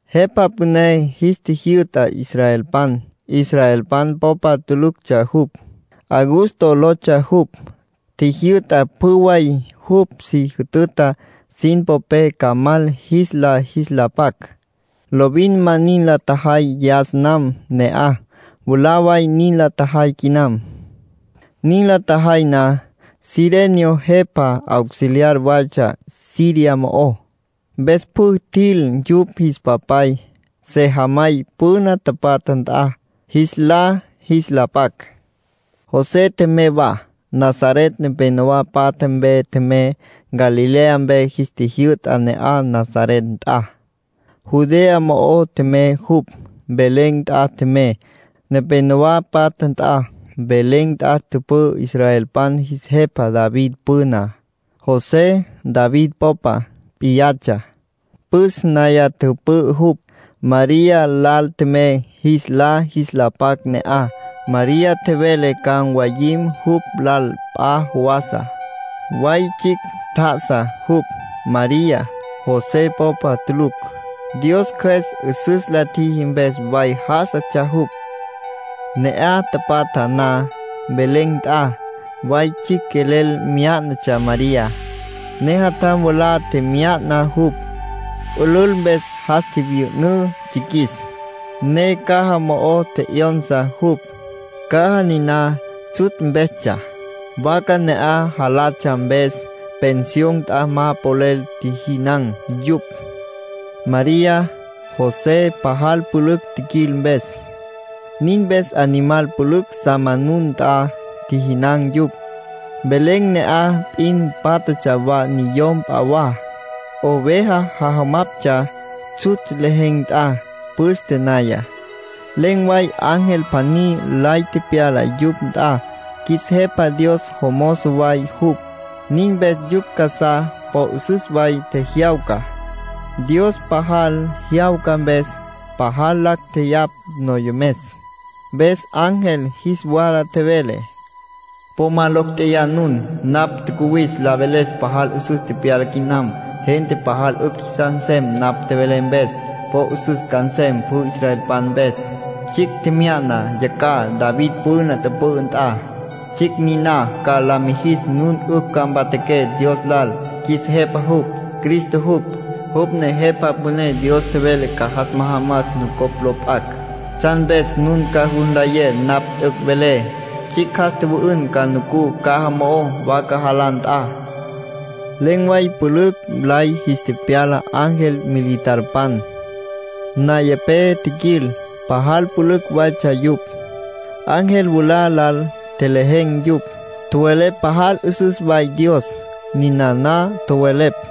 Jepa püné jis tjijyü'ta israelpan. Israelpan popa tuluctsja jupj. Augusto lotsja jupj. Tjijyü'ta pjü way jupj si jütüta sin popé ca mal jis lá jis la pac. Lovin ma nin la tjajay yas nam ne'aj; mwalá way nin la tjajay quinam. (Nin la tjajay na, Cirenio jepa auxiliar waytsja Siria mo'ó.) Mpes pjü tjil yupj jis papay, sejamay püna tapatja nt'a, jis lá jis la pac. José tjemey wa. Nazaret nepénowa patja mpe tjemey. Galilea mpe jis tjijyü'ta ne'aj Nazaret nt'a. Judea mo'o tjemey jupj, Belén nt'a tjemey, nepénowa patja nt'a. Belén nt'a tüpü'ü israelpan jis jepa David püná. José David popa p'iyatsja, püs naya tüpü'ü jupj. María lal tjemey jis lá jis la pac ne'aj. María tjevele ca mwayim jupj lal p'a jawasa. Way tsjicj tjá'asa jupj, María, José popa tulucj. Dios Cjües 'üsüs la tjiji mpes way já'asatsja jupj. Ne'aj tapatja na, Belén nt'a, way tsjicj quelel myá'natsja María, ne jatjam mwalá tjemya'na jupj. Pülül mpes jas tjivyü'ünǘ tsjiquis, ne caja mo'o tje'yonsa jupj, caja niná tsjutsj mpestsja, vaca ne'aj jalatsja mpes. Pensión nt'a ma polel tjijinan̈ yupj, María, José, pajal pülücj tjiquil mpes. Nin mpes animal pülücj sa manun nt'a tjijinan̈ yupj. Belén ne'aj p'in tapatja wa niyom p'a wa. Oveja jajamaptsja tsjutsj lejen̈ nt'a, püste naya. Len̈ way ángel pjaní lay tepyala yupj nt'a. Qjuis Jepa Dios jomozo way jupj. Nin mpes yupj casá po 'üsüs way tjejyawca, Dios pajal jyawca mpes. Pajal lacj tjeyapj noyomes. Mpes ángel jis wala tjevele: “Po ma locj tjeyá nun. Napj tjacuwis la veles pajal 'üsüs tepyala quinam. Gente pajal 'ücj jisas nsem napj velé mpes. Po 'üsüs ca nsem pjü israelpan mpes. Tsjicj tjemya'na yacjaj, David püna tüpü'ü nt'a. Tsjicj niná ca la mijis nun 'ücj ca mpatjaqué Dios lal. Qjuis Jepa jupj. Cristo jupj. Jupj ne Jepa Püné Dios tjevele ca jas majamas nucopj lo p'acj. Tsjan mpes nun ca jus nlayé napj t'üc' velé: tsjicj jas tjüwü'ün ca nucú caja mo'ó, vaca jalá nt'a.” Len̈ way pülücj lay jis tepyala ángel militarpan, nayapé tjiquil. Pajal pülücj waytsja yupj. Ángel mwalá lal tjelejen̈ yupj, tjowelepj pajal 'üsüs way Dios. Ninana tjowelepj: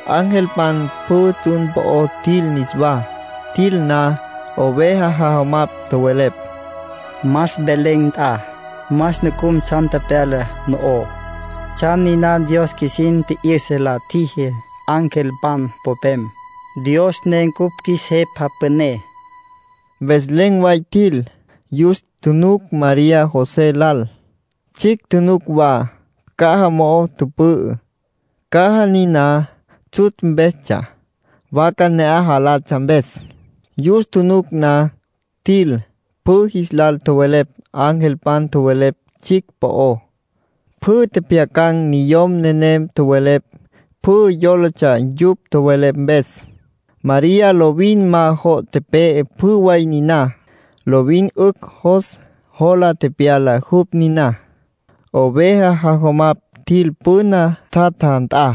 Angelpan pjü tsjun po'o tjil niswá. Tjil na, oveja jajamapj tjowelepj: “Mas Belén nt'a. Mas nucum tsjan tepyalá no'oj, tsjan niná Dios qjuisin tji'yüsa la tjiji angelpan popem, Dios ne cupj qjuis Jepa Püné.” Mpes len̈ way tjil. Yus tjunuc María José lal. Tsjicj tjunuc wa, caja mo'o tüpü'ü, caja niná tsjutsj mpestsja, vaca ne'aj jalatsja mpes. Yus tjunuc na, tjil, pjü jis lal tjowelepj angelpan tjowelepj tsjicj po'ó. Pjü tjepjyacan̈ niyom nenem tjowelepj, pjü yólatsja yupj tjowelepj mpes. María lovin ma jo' tepe'e pjü way niná. Lovin 'ücj jos jola tepyala jupj niná. Oveja jajamapj tjil püna tjatja nt'a.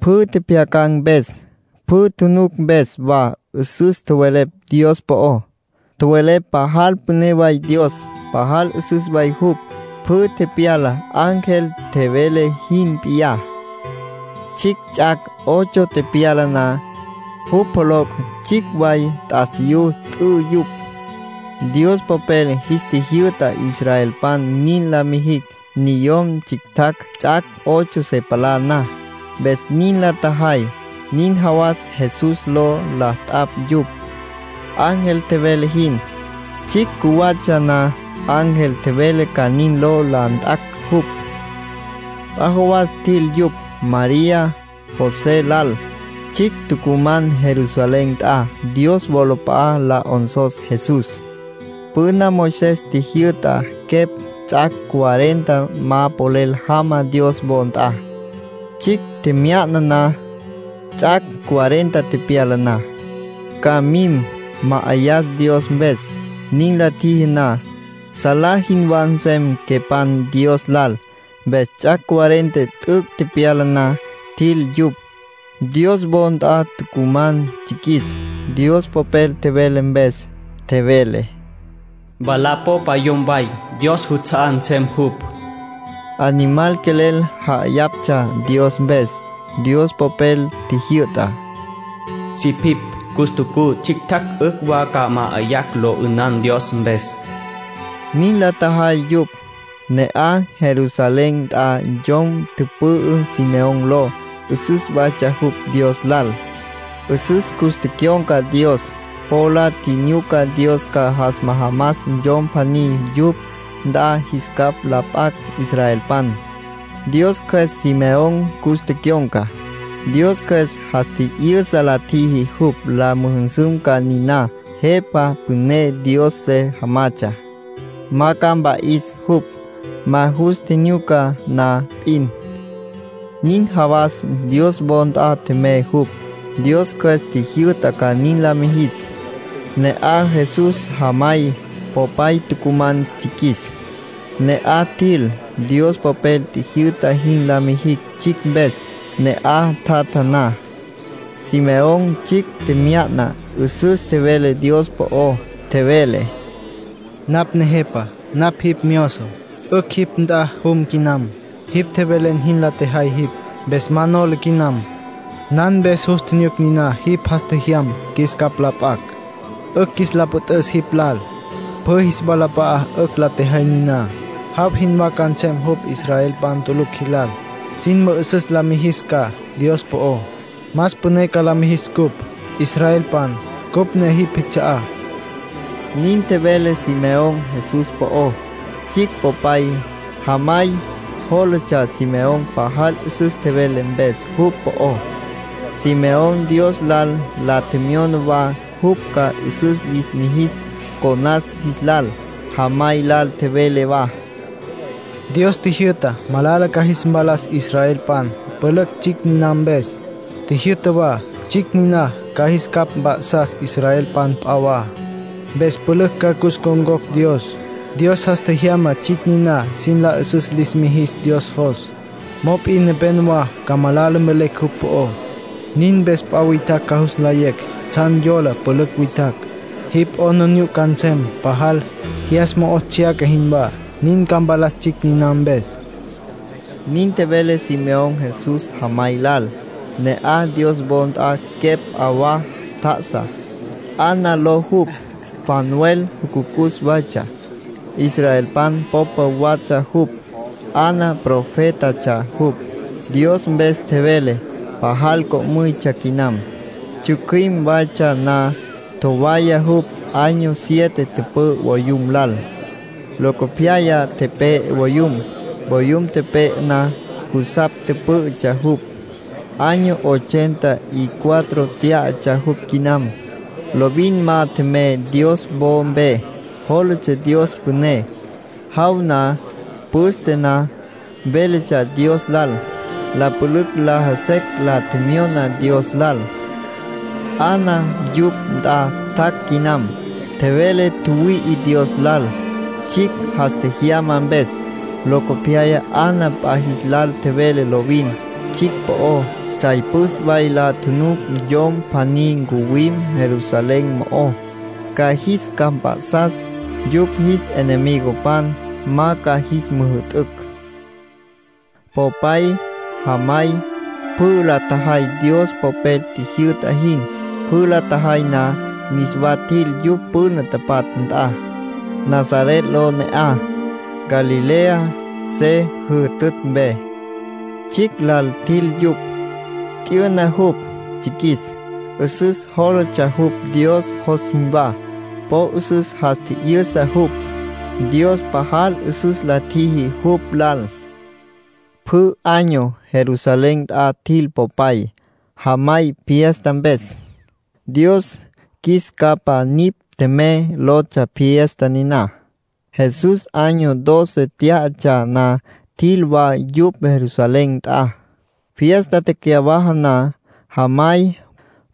Pjü tjepjyacan̈ mpes, pjü tjunuc mpes wa 'üsüs tjowelepj Dios po'ó. Tjowelepj pajal püné way Dios, pajal 'üsüs way jupj. Pjü tepyala ángel tjevele jin p'iyá. Tsjicj ts'ac' ocho tepyala na, jupj pjoloc' tsjicj way t'asiyú t'ü yupj. Dios Popel jis tjijyü'ta israelpan nin la mijicj niyom tsjictjacj ts'ac' ocho se palá na, mpes nin la tjajay. Nin jawas Jesús ló la t'apj yupj, ángel tjevele jin. Tsjicj cjuwatsja na ángel tjevele ca nin ló la nt'acj jupj. P'a jawas tjil yupj, María José lal. Tsjicj tucuman Jerusalén nt'a, Dios wolap'a'a la 'onsos Jesús. Püna Moisés tjijyü'ta quepj ts'ac' cuarenta ma polel jama Dios wo nt'a, tsjicj tjemya'na na. Ts'ac' cuarenta tepyala na, ca mim, ma'ayas Dios mpes. Nin la tjiji na, salá jinwá nsem quepan Dios lal. Mpes ts'ac' cuarenta t'üc' tepyala na, tjil yupj. Dios wo nt'a tucuman tsjiquis, Dios Popel tjevele mpes. Tjevele: “Mwalá popa yom way, Dios juts'a'á nsem jupj”. Animal quelel ja'ayaptsja Dios mpes. Dios Popel tjijyü'ta: “Sipipj, castucú tsjictjacj 'ücj wa ca ma'ayacj lo 'ünan Dios mpes”. Nin la tjajay yupj. Ne'aj Jerusalén nt'a yom tüpü'ü Simeón ló. 'Üsüs waytsja jupj Dios lal, 'üsüs cus tecyon̈ca Dios. Po la tjinyuca Dios ca jas majamas Yom pjaní yupj nt'a jis capj la p'acj israelpan. Dios Cjües Simeón cus tecyon̈ca. Dios Cjües jas tji'yüsa la tjiji jupj la müjüsüm ca niná Jepa Püné Dios se jamatsja. Ma ca mpa'is jupj, ma jus tjinyuca na p'in. Nin jawas Dios wo nt'a tjemey jupj; Dios Cjües tjijyü'ta ca nin la mijis. Ne'aj Jesús jamay, popay tucuman tsjiquis. Ne'aj tjil, Dios Popel tjijyü'ta jin la mijicj tsjicj mpes. Ne'aj tjatja na, Simeón tsjicj tjemya'na. 'Üsüs tjevele Dios po'ó. Tjevele: “Napj Nejepa, napj jipj myozo, 'ücj jipj nt'a jum quinam. Jipj tjevelen jin la tjejay jipj, mpes ma nola quinam. Nan mpes jus tjinyuc niná jipj jas tjejyam qjuis capj la p'acj, 'ücj qjuis la püt'üs jipj lal. Pjü jis walap'a'a 'ücj la tjejay niná. Jaw jinwá ca nsem jupj israelpan tulucj jilal. Sin mü'üsüs la mijis ca Dios po'ó. Más püné ca la mijis ncupj, israelpan, cupj ne jipj jits'a'á”, nin tjevele Simeón Jesús po'ó. Tsjicj popay, jamay yólatsja Simeón pajal 'üsüs tjevele mpes jupj po'ó. Simeón Dios lal la tjemyona wa jupj ca 'üsüs lis mijis conas jis lal. Jamay lal tjevele wa: “Dios tjijyü'ta malala ca jis mpalas israelpan pülücj tsjicj niná mpes. Tjijyü'ta wa tsjicj niná ca jis capj mp'a'sas israelpan p'a wa, mpes pülücj ca cus ncon̈cocj Dios. Dios jas tjejyama tsjicj niná sin la 'üsüs lis mijis Dios jos. Mop'in nepénowa ca malala mvelecj jupj po'ó. Nin mpes p'a witjacj ca jus nlayecj tsjan yola pülücj witjacj. Jipj 'aplijila ca nsem pajal, jyas mo'o tsjyaca jinwá. Nin ca mpalas tsjicj niná mpes”, nin tjevele Simeón Jesús jamay lal. Ne'aj Dios wo nt'a quepj p'a wa tjá'asa, Ana ló jupj, Fanuel jucucus waytsja. Israelpan popa watsja jupj. Ana profétatsja jupj, Dios mpes tjevele. Pajal co'müytsja quinam. Tsjücjüim waytsja na, tjowaya jupj. Año siete tüpü'ü voyum lal, locopyaya tepe'e voyum. Voyum tepe'e na, jusapj pǘ'ütsja jupj. Año ochenta y cuatro tyá'atsja jupj quinam. Lovin ma tjemey Dios wo mpe. Jólatsja Dios püné. Jaw na, püste na véletsja Dios lal. La pülücj laja secj la tjemyona Dios lal. Ana yupj nt'a tjac' quinam. Tjevele tjüwüi'i Dios lal, tsjicj jas tjejyama mpes. Locopyaya Ana p'a jis lal tjevele lovin, tsjicj po'ó. Tsjay püs way la tjunuc yom pjaní ncuwim Jerusalén mo'ó, ca jis capj mp'a'sas, yupj jis enemigopan ma ca jis müjü'tücj. Popay, jamay, pjü la tjajay Dios Popel tjijyü'ta jin. Pjü la tjajay na, niswa tjil yupj püna tapatja nt'a. Nazaret ló ne'aj, Galilea se jütütj mpe. Tsjicj lal tjil yupj. T'yüna jupj, tsjiquis. 'Üsüs jólatsja jupj Dios jos jinwá. Po 'üsüs jas tji'yüsa jupj. Dios pajal 'üsüs la tjiji jupj lal. Pjü año Jerusalén nt'a tjil popay, jamay, fiesta mpes. “Dios Qjuis Capa Nipj Tjemey” lotsja fiesta niná. Jesús año doce tyá'atsja na, tjil wa yupj Jerusalén nt'a. Fiesta tecyawaja na, jamay,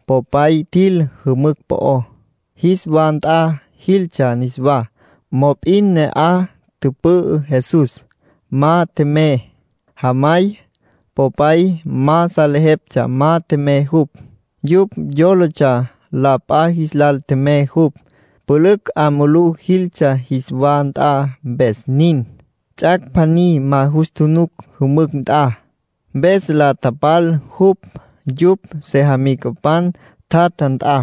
popay tjil jümücj po'ó, jis wa nt'a jiltsja niswá. Mop'in ne'aj tüpü'ü Jesús, ma tjemey. Jamay, popay, ma salejeptsja ma tjemey jupj. Yupj yólatsja la p'a jis lal tjemey jupj. Pülücj 'a mulú jiltsja jis wa nt'a, mpes nin. Ts'ac' pjaní ma jus tjunuc jümücj nt'a, mpes la tapal jupj yupj sejamicapan tjatja nt'a,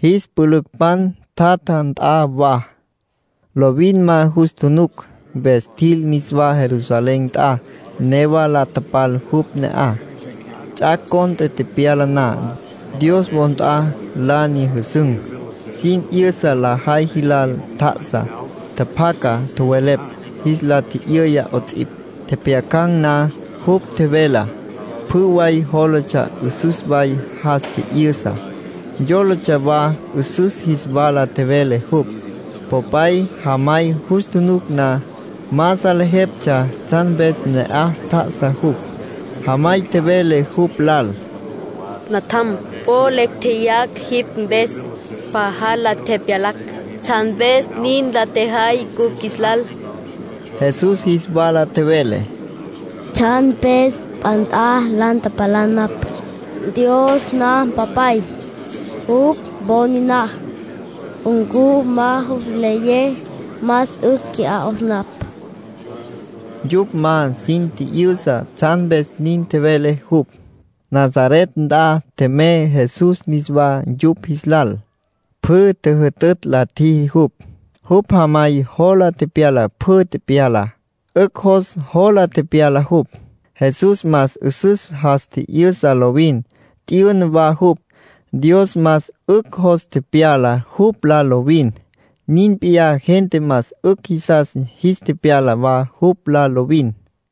jis pülücpan tjatja nt'a wa. Lovin ma jus tjunuc, mpes tjil niswá Jerusalén nt'a, newa la tapal jupj ne'aj. Ts'ac' cont'e tepyala na, Dios wo nt'a la nyüjüsün̈. Sin 'yüsa lajay jilal tjá'asa. Tjapjaca tjowelepj, jis la tji'yüya 'ots'ipj. Tjepjyacan̈ na jupj tjevelá, pjü way yólatsja 'üsüs way jas tji'yüsa. Yólatsja wa 'üsüs jis wala tjevele jupj. Popay, jamay jus tjunuc na, ma salejeptsja tsjan mpes ne'aj tjá'asa jupj. Jamay tjevele jupj lal: —Natjam, po lecj tjeyacj jipj mpes, pajal la tepyalacj. ¿Tsjan mpes nin la tjejay cupj qjuis lal? Jesús jis wala tjevele: —¿Tsjan mpes p'a nt'a la tapalá napj? Dios napj Mpapay. Jupj wo niná. ¿Ncu ma jus nlayé más 'ücj qui'á 'os napj? Yupj ma sin tji'yüsa tsjan mpes nin tjevele jupj. Nazaret nt'a tjemey Jesús niswá yupj jis lal. Pjü tjüjütütj la tjiji jupj. Jupj jamay jola tepyala pjü tepyalá. 'Ücj jos jola tepyala jupj. Jesús más 'üsüs jas tji'yüsa lovin. T'yüna wa jupj. Dios más 'ücj jos tepyala jupj lal lovin. Nin p'iyá gente más 'ücj jisas jis tepyala wa jupj lal lovin.